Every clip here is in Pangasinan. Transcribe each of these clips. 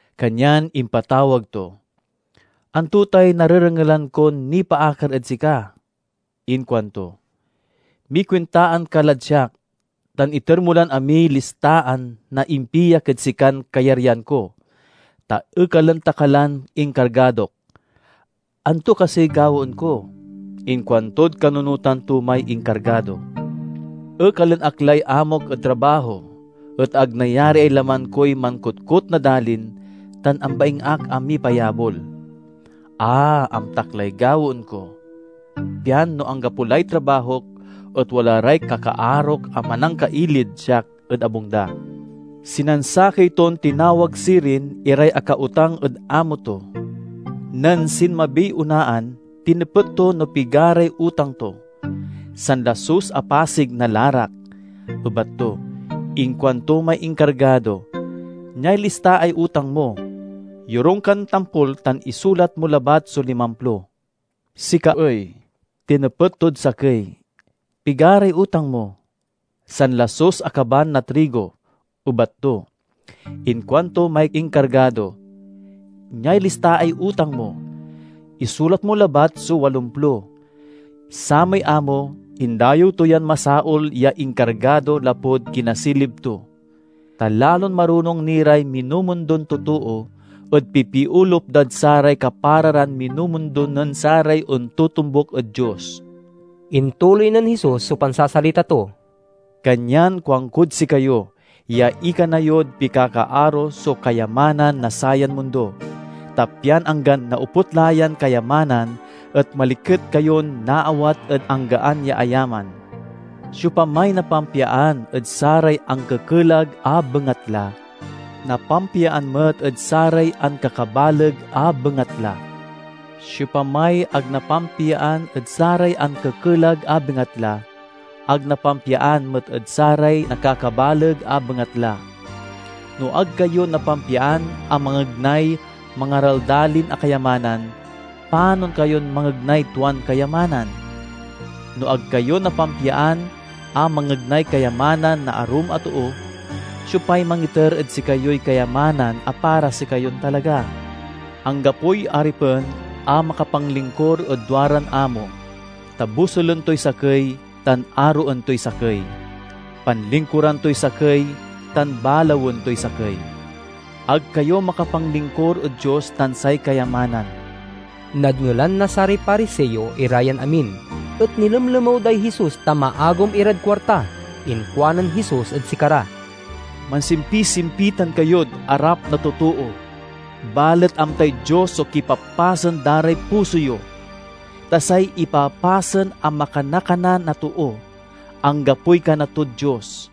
kanyan impatawag to. 'Anto tay narerengelan kon nipaakar ed sika?' inkuanto. 'Mikuintaan ka lad siak, tan iter mo lan amiy listaan na impiak ed sikan kayaryan ko, ta ekalen ta ka lan inkargadok.' 'Anto kasiy gawaen ko?' inkuantod kanunotan to may inkargado. 'Ekalen ak lay amok ed trabaho, et ag nayariay laman koy mankotkot na dalin tan ambaing ak a mipayabol. A, amtak lay gawaen ko, pian no anggapo lay trabahok et wala ray kakaarok a manangkailid siak ed abung da.' Sinansakey ton tinawag sirin iray akautang ed amo to. Nen sinmabiy onaan, tinepet to no pigaray utang to. 'Sanlasus a pasig na larak,' ebat to. Inkuanto may inkargado, 'Niay listaay utang mo. Yorung kan tampol tan isulat mo labat so limamplo.' 'Sika ay,' tinepet tod sakey, 'pigaray utang mo?' 'Sanlasus a kaban na trigo,' ebat to. Inkuanto may inkargado, 'Niay listaay utang mo. Isulat mo labat so walomplo.' Samay amo indayew to yan masaol ya inkargado lapud kinasilib to. Ta lalon marunong ni ray minumundon totoo ed pipiolup dad saray kapara ran minumundo nen saray ontotombuk ed Dios." Intuloy nen Jesus so pansasalita to, "Kanyan kuankod sikayo ya ikana yod pikakaaro so kayamanan na sayan mundo, ta pian anggan naoput la yan kayamanan et maliket kayon naawat ed anggan ya ayaman. Siopamay napampiaan ed saray ankekelag a bengatla, napampiaan met ed saray ankakabaleg a bengatla. Siopamay ag napampiaan ed saray ankekelag a bengatla, ag napampiaan met ed saray nakakabaleg a bengatla. No ag kayo napampiaan a mangegnay mangaraldalin a kayamanan, panon kayon mangegnay tuan kayamanan? No ag kayo napampiaan a mangegnay kayamanan na arum a too, siopay mangiter ed sikayoy kayamanan a para sikayon talaga? "Anggapoy aripen a makapanlingkur ed duaran amo, ta bosulen toy sakey tan aroen toy sakey; panlingkuran toy sakey tan balawen toy sakey. Ag kayo makapanlingkur ed Dios tan say kayamanan." Nadngelan na saray Pariseo ira yan amin, et nilemlemew day Jesus ta maagum irad kuarta. Inkuanen Jesus ed sikara, "Mansimpisimpitan kayod arap na totoo, balet amtay Dios so kipapasen da ray puso yo. Ta say ipapasen a makanakana na too, anggapoy kana tod Dios.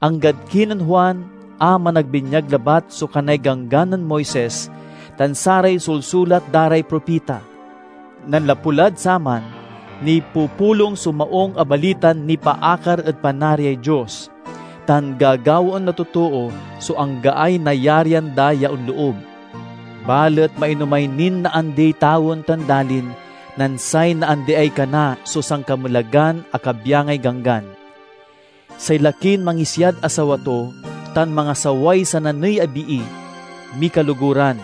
"Anggad kinen Juan a Managbinyag labat so kanay Ganggan nen Moises tan saray sulsulat da ray propita. Nanlapu lad saman, nipupulong so Maung a Balitan nipaakar ed Panariay Dios, tan gagawaen na totoo so anggaay nayarian da ya onloob. Balet mainomay nin naandiy tawen tan dalin nen say naandiay kana so sankamelagan a kabyangay Ganggan. "Say lakin mangisiad asawa to tan mangasaway sananey a bii, mikaloguran.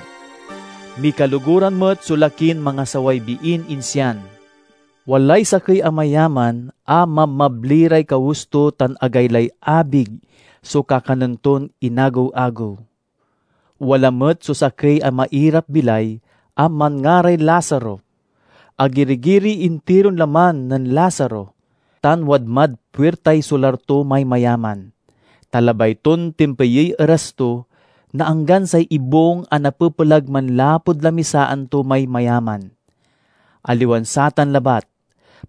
Mikaloguran met so lakin mangasaway biin insian." "Walay sakey a mayaman a mabmabli ray kawes to tan agaylay abig so kakanen ton inagew-agew. Wala met so sakey a mairap-bilay a manngaray Lazaro. Agiri-giriy intiron laman nen Lazaro, tan wadmad puirtay solar to may mayaman, ta labay ton tempeyey eras to na anggan say ibung a napepelag manlapud lamisaan to may mayaman. Aliwan satan labat,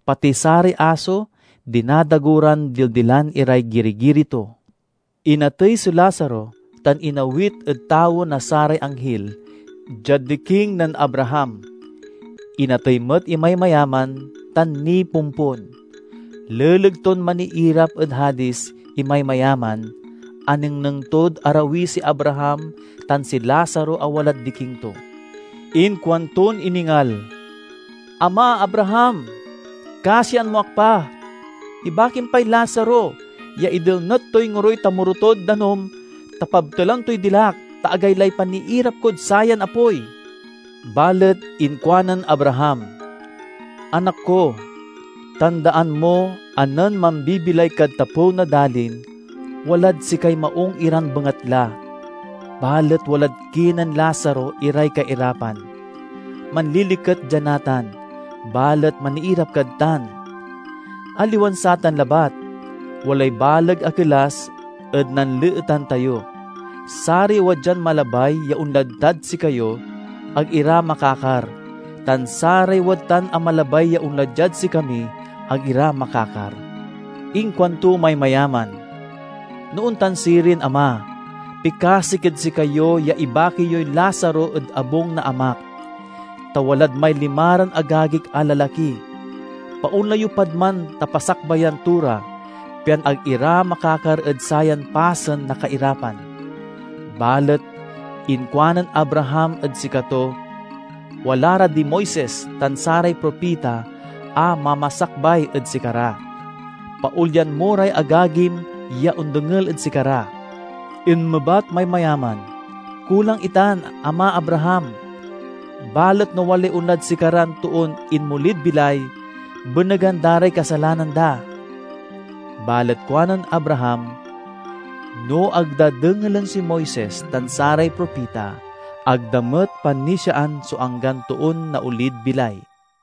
pati saray aso dinadago ran dildilan iray giri-giri to. Inatey si Lazaro, tan inawit ed tawen na saray anghil, diad diking nen Abraham. Inatey met imay mayaman, tan nipompon. Leleg ton maniirap ed Hadis imay mayaman, anengneng tod arawi si Abraham tan si Lazaro a walad diking to. Inkuanton iningal, 'Ama Abraham, kasian mo ak pa! Ibakim pay Lazaro ya idelnet toy ngoroy tamoro tod danum ta pabtelan toy dilak, ta agaylay paniirap kod sayan apoy!' Balet inkuanen Abraham, 'Anak ko, tandaan mo a nen mambibilay kad tapew na dalin, walad sikay maung iran bengatla, balet walad kinen Lazaro iray kairapan. Manliliket dia natan, balet maniirap kad tan. Aliwan satan labat! Walay baleg a kelas ed nanleetan tayo. Saray wadyan malabay ya onlad tad sikayo, ag ira makakar; tan saray wadtan a malabay ya onla diad sikami, ag ira makakar.' Inkuanto may mayaman, 'No ontan sirin, ama, pikasik ed sikayo ya ibaki yoy Lazaro ed abung na amak, ta walad may limaran agagik a lalaki. Paonla yo pad man ta pasakbayan to ra, pian ag ira makakar ed sayan pasen na kairapan.' Balet inkuanen Abraham ed sikato, 'Wala ra di Moises tan saray propita a mamasakbay ed sikara. Paolyan mo ray agagim ya ondengel ed sikara.' Inmebat may mayaman, 'Kulang itan, ama Abraham! Balet no walay onlad sikaran toon inmolid bilay, benegan da ray kasalanan da.' Balet kuanen Abraham, 'No ag da dengelen si Moises tan saray propita, ag da met panisiaan so anggan toon naolid bilay.'"